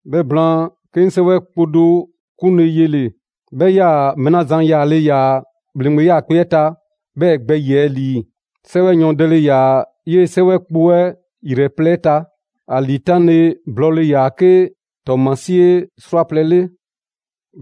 'Bhɛ blaan, 'ke 'ŋ 'sɛwɛ kpo do 'klule‑ yele‑. 'Bhɛ 'yaa‑ mɛɛ 'la zan yaale ‑yaa ‑bhleŋgbe 'yaakpe‑ 'ɛ ta 'bhɛɛ‑ gbɛ ‑yiɛ' ‑lii. 'Sɛwɛ yɔɔndɛle ‑yaa 'yee‑ 'sɛwɛ kpo 'ɛ 'yrɛ plɛ 'ɛ ta. ‑A ‑liitanle blɔɔle ‑yaa 'ke ‑tɔɔmasie 'srwaplɛ‑ 'le.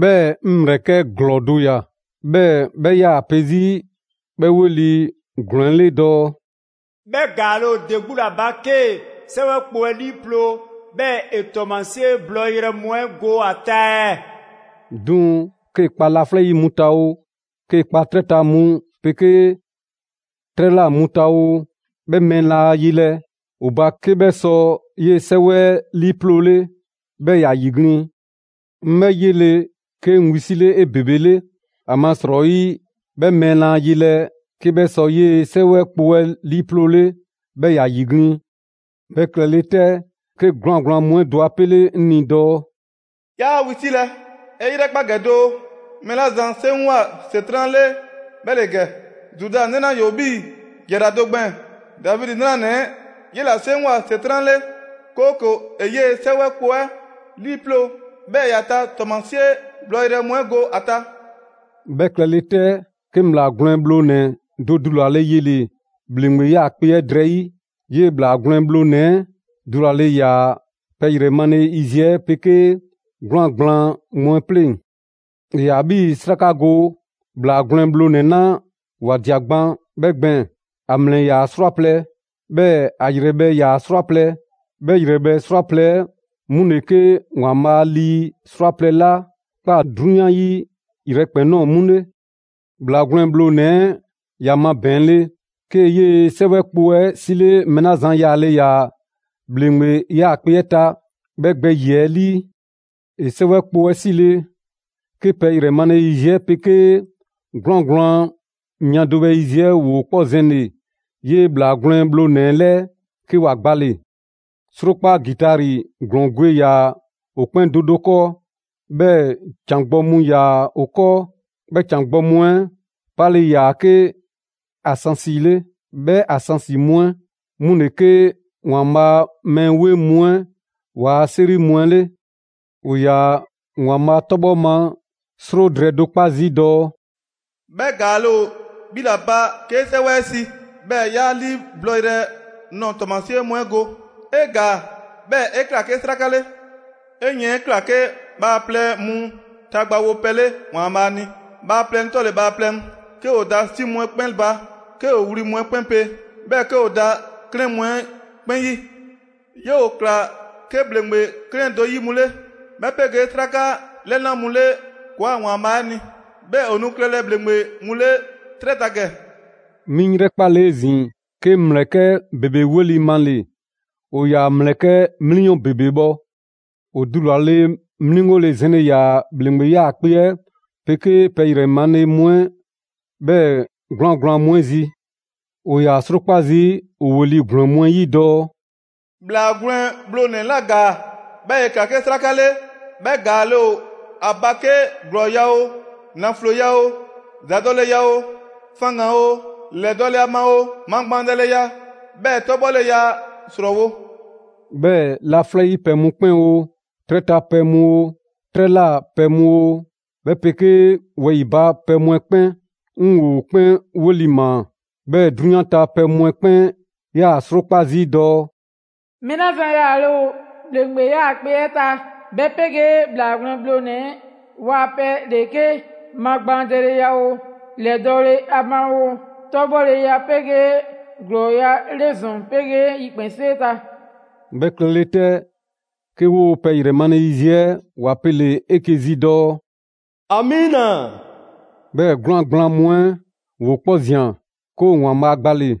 'Bhɛɛ‑ 'ŋ ‑mlɛkɛ' ‑glɔɔ do ꞊ya, 'bhɛɛ‑ 'bhɛ 'yaa‑ pe 'zi 'bhɛ 'weli‑ ‑glɔɔ 'ɛ 'le dɔɔ: «'Bhɛ ‑gaale' ‑o ‑de 'gbu ‑la ba 'kee‑ 'sɛwɛ kpo 'ɛ 'liiploo‑, 'bhɛɛ‑ ‑e ‑tɔɔmasie blɔyrɛ mu 'ɛ go ‑a ta ɛɛ?» 'Duŋ‑, 'kee‑ kpa laflɛ' 'yi mu ta oo, 'kee‑ kpa 'trɛ ta mu 'pegee 'trɛ ꞊la mu ta oo, 'bhɛ mɛɛ laa yelɛ ‑o ba 'ke 'bhɛ sɔ 'yee‑ 'sɛwɛ 'ɛ 'liiploole 'bhɛɛ‑ ‑ya ‑yiglin'. 'Ŋ 'bhɛ 'yele‑, 'ke 'ŋ wisile 'ebebele, ‑amasrɔyi, 'bhɛ mɛɛ laa yelɛ 'ke 'bhɛ sɔ 'yee‑ 'sɛwɛ kpo 'ɛ 'liiploole, 'bhɛɛ‑ ‑ya ‑yiglin'. 'Bhɛ klɛle 'tɛ, 'ke 'gwlaan‑ gblaan mu 'ɛ do 'a 'pele 'ŋ ni dɔɔ: «'Yaa wisilɛ, 'e 'yrɛkpa ‑gɛ doo, mɛɛ 'la zan 'seŋgwa‑ ‑Setran' 'le 'bhɛ ‑le ‑gɛ: Zuda 'nɛ 'la ‑yoo 'bhii‑ ‑jara do gbɛɛn‑, Davidi 'nranɛ‑ 'ɛ, 'yela‑ 'seŋgwa‑ ‑Setran' 'le, 'kooko‑ ‑e 'yee‑ 'sɛwɛ kpo 'ɛ 'liiploo‑, 'bhɛɛ‑ ‑ya ta ‑tɔɔmasie blɔyrɛ mu 'ɛ go ‑a ta.» 'Bhɛ klɛle 'tɛ, 'ke 'ŋ ‑Bhlaa Gwlɛn Bhlonɛ‑ do dulale yele‑ ‑bhleŋgbe 'yaakpe‑ 'ɛ drɛyi'. 'Yee‑ ‑Bhlaa Gwlɛn Bhlonɛ‑ 'ɛ dulale ‑yaa pɛ ‑yrɛ male yiziɛ 'ɛ 'pegee 'gwlaan‑ gblaan mu 'ɛ 'pleŋ‑. ‑E ‑yaa 'bhii‑ 'sraka go ‑Bhlaa Gwlɛn Bhlonɛ‑ 'la ‑wa ꞊dia gban 'bhɛ gbɛɛn‑. ‑A ‑mlɛ ‑yaa 'srwaplɛ‑, 'bhɛɛ‑ ‑a ‑yrɛbhɛ' ‑yaa 'srwaplɛ‑. 'Bhɛ 'yrɛbhɛ‑ 'srwaplɛ‑ 'ɛ 'mu ‑le 'ke ‑Waanbhaa' a lii 'srwaplɛ‑ 'la ꞊kpaa 'drunyan 'ɛ 'yi yrɛkpɛn‑ ꞊nɔɔ 'mu 'le. ‑Bhlaa Gwlɛn Bhlonɛ‑ 'ɛ ‑ya mabɛɛnle, 'kee‑ 'yee‑ 'sɛwɛ kpo 'ɛ 'sile mɛɛ 'la zan yaale ‑yaa ‑bhleŋgbe 'yaakpe‑ 'ɛ ta 'bhɛ gbɛ ‑yiɛ' 'ɛ 'lii. ‑E 'sɛwɛ kpo 'ɛ 'sile‑, 'ke pɛ ‑yrɛ male yiziɛ 'ɛ 'pegee 'gwlaan‑ gblaan mia do bhɛ yiziɛ 'ɛ ‑woo 'kpɔ zɛnle‑ 'yee ‑Bhlaa Gwlɛn Bhlonɛ‑ 'ɛ 'lɛɛ, 'ke ‑wa gbale‑. 'Srokpa ‑gitari ‑glɔɔn gwe ‑yaa ‑o 'kpɛn do do 'kɔɔ, 'bhɛɛ‑ ‑can gbɔ mu ‑yaa 'o 'kɔɔ. 'Bhɛ ‑can gbɔ mu 'ɛ 'pale‑ ‑yaa 'ke ansansi 'le. 'Bhɛ ansansi mu 'ɛ 'mu ‑le 'ke ‑Waanbhaa' a mɛɛ 'weŋ mu 'ɛ ‑waa' 'seri mu 'ɛ 'le. ‑O ‑yaa ‑Waanbhaa' 'tɔbhɔ ma 'sro drɛɛ do 'kpa zii' dɔɔ: «'Bhɛ ‑gaale' ‑o 'bhi ‑la ba 'kee 'sɛwɛ 'ɛ 'si, 'bhɛɛ‑ 'ya 'lii blɔyrɛ nɔɔ‑ ‑tɔɔmasie mu 'ɛ go. 'E ‑gaa 'bhɛɛ ‑e ꞊kla 'ke 'sraka 'le. 'E 'yiɛn ꞊kla 'ke bhaaplɛŋ mu ta gbawopɛ 'le ‑Waanbhaa' ni: bhaaplɛŋ 'tɔle‑ bhaaplɛŋ, 'ke ‑o da 'si mu 'ɛ kpɛn ba, 'ke ‑o wli mu 'ɛ 'kpɛn pe, 'bhɛɛ‑ 'ke ‑o da 'klɛɛn mu 'ɛ 'kpɛn 'yi. 'Yoo‑ ‑kla 'ke ‑bhleŋgbe 'klɛɛn do 'yi mu 'le, 'bhɛ 'pegee 'sraka 'lɛna mu 'le ‑kɔɔa' ‑Waanbhaa' 'ɛ ni. 'Bhɛɛ‑ ‑o nu klɛlɛ ‑bhleŋgbe mu 'le 'trɛ ta ‑gɛ.» 'Mi 'ŋ 'yrɛkpale 'ezin‑, 'ke 'ŋ ‑mlɛkɛ' ‑bebe 'weli male‑: ‑o ‑yaa ‑mlɛkɛ' 'mliyɔn ‑bebe bhɔ. ‑O dulale mliŋgole zɛnle ‑yaa ‑bhleŋgbe 'yaakpe‑ 'ɛ 'pegee pɛ ‑yrɛ male mu 'ɛ, 'bhɛɛ‑ 'gwlaan‑ gblaan mu 'ɛ zi. ‑O ‑yaa 'srokpa zii' ‑o ‑weli' ‑glɔɔ mu 'ɛ 'yi dɔɔ: «‑Bhlaa Gwlɛn Bhlonɛ‑ 'la ‑gaa, 'bhɛɛ‑ ‑e ‑kla 'ke 'sraka 'le, 'bhɛ ‑gaale' ‑o ‑a ba 'kee‑ ‑glɔɔya' oo, ‑nafloya oo, ‑zadɔleya oo, faŋgan oo, lɛdɔle a ma oo, magbaandɛleya 'bhɛɛ‑ 'tɔbhɔleya 'srɔɔwo‑!» 'Bhɛɛ‑ laflɛ' 'yi pɛ mu 'kpɛn oo, 'trɛ ta pɛ mu oo, 'trɛ ꞊la pɛ mu oo, 'bhɛ 'pegee wɛyi‑ ba pɛ mu 'ɛ 'kpɛn, 'ŋ ‑wo 'kpɛn 'weli‑ ‑maa. 'Bhɛɛ‑ 'drunyan ta pɛ mu 'ɛ 'kpɛn 'yaa‑ 'srokpa zii' dɔɔ: «Mɛɛ 'la zan yaale ‑o ‑bhleŋgbe 'yaakpe‑ 'ɛ ta, 'bhɛ 'pegee ‑Bhlaa Gwlɛn Bhlonɛ‑ 'ɛ ‑waa pɛ ‑le 'ke magbaandɛleya oo, ‑lɛdɔle a ma oo, 'tɔbhɔleya 'pegee ‑glɔɔya' 'le ‑zɔn 'pegee yikpɛnsee ta!» 'Bhɛ klɛle 'tɛ, 'ke 'woo‑ pɛ ‑yrɛ male yiziɛ 'ɛ ‑wa pele‑ 'eke‑ zi dɔɔ: «‑Amiina!» 'Bhɛɛ‑ 'gwlaan‑ gblaan mu 'ɛ ‑woo 'kpɔ ꞊zian, 'ke ‑o ‑Waanbhaa' gbale‑.